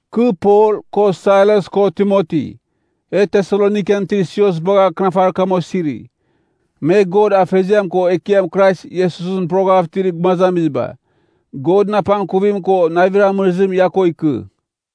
Kɨ Pol, ko Sailas ko Timoti, e Tesalonikan itir sios bagha akɨnafarir kam osiri, me God Afeziam ko Ekiam Krais Iesusɨn poroghav itir gumazamiziba: Godɨn apangkuvim ko navir amɨrɨzim ia ko ikɨ.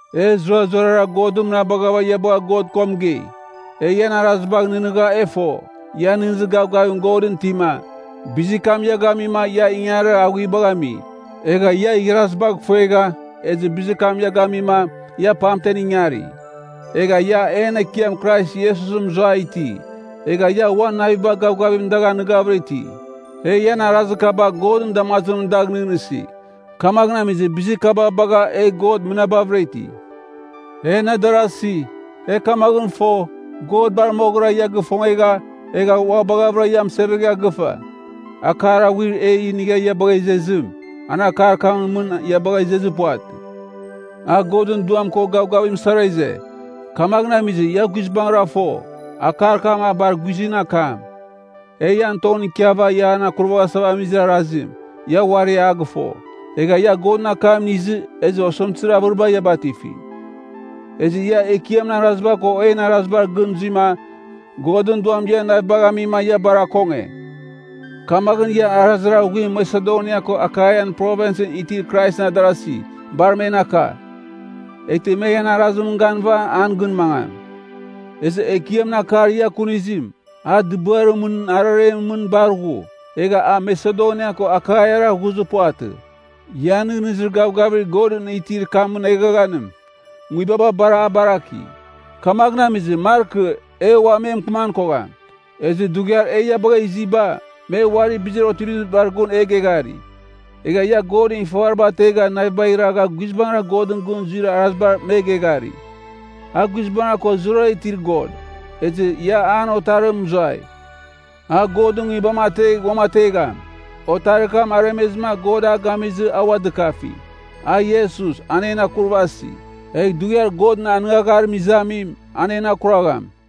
E zurazurara God mɨnabaghava ia bagha God ko mɨgei. E ian arazibagh nɨghnɨgha e fo, ia nɨghnɨzir gavgavim Godɨn itima, bizir kam ia gamima ia ingangarir aghuibagh ami. Egha ia igharazibagh ifuegha, ezɨ bizir kam ia gamima, ia pamtem ingari. Egha ia en Ekiam Krais Iesusɨn mɨzua iti, egha ia uan naviba gavgavim dagh anɨghavɨra iti. E ian arazir kaba Godɨn damazimɨn dagh nɨghnɨsi. Kamaghɨn amizɨ bizir kaba bagha e God mɨnabavɨra iti. En adarasi, e kamaghɨn fo, God bar moghɨra ia gifongegha, egha ua baghavɨra ia amɨsevegha gɨfa. Akar aghuir e inigha ia bagha izezim, an akar kɨnimɨn mɨn ia bagha izezir puvatɨ. A Godɨn Duam ko gavgavim sara ize, kamaghɨn amizɨ, ia guizbangɨra fo, akar kam a bar guizɨn akam. E ian tongɨn ikiava ian akuraghasava amizir arazim, ia uari a gɨfo. Egha ia Godɨn akam inizɨ, ezɨ osɨmtɨzir avɨriba ia batifi, ezɨ ia Ekiamɨn araziba ko en arazibar gɨn zuima, Godɨn Duam ian navibagh amima ia bar akonge. Kamaghɨn ia arazir aghuim Masedonia ko Akaian Provinsɨn itir Kraisɨn adarazi, bar men aka. Eghtɨ me ian arazimɨn ganɨva an gɨn mangam. Ezɨ Ekiamɨn akar ia kunizim, a dɨbɨarimɨn araremɨn mɨn bar ghu. Egha a Masedonia ko Akaiara ghuzɨ puvatɨ, ian nɨghnɨzir gavgavir Godɨn itir kamɨn eghaghanim, nguibaba bar a baraki. Kamaghɨn amizɨ, markɨ e ua me mɨkɨman kogham. Ezɨ dughiar e ia bagha iziba, me uari bizir otivizibar gun e geghari. Egha ia godɨn ifavariba ategha navibagh iragha guizbangɨra Godɨn gɨn zuir arazibar me geghari. A guizbangɨra ko zurara itir God. Ezɨ ia an Otarimɨn mɨzuai, a Godɨn Nguibam ategh uamategham. Otarir kam aremezɨma God a gamizɨ, a ua dɨkafi. A Iesus, an en akurvasi, egh dughiar Godɨn anɨngagharim izamim, an en akuragham.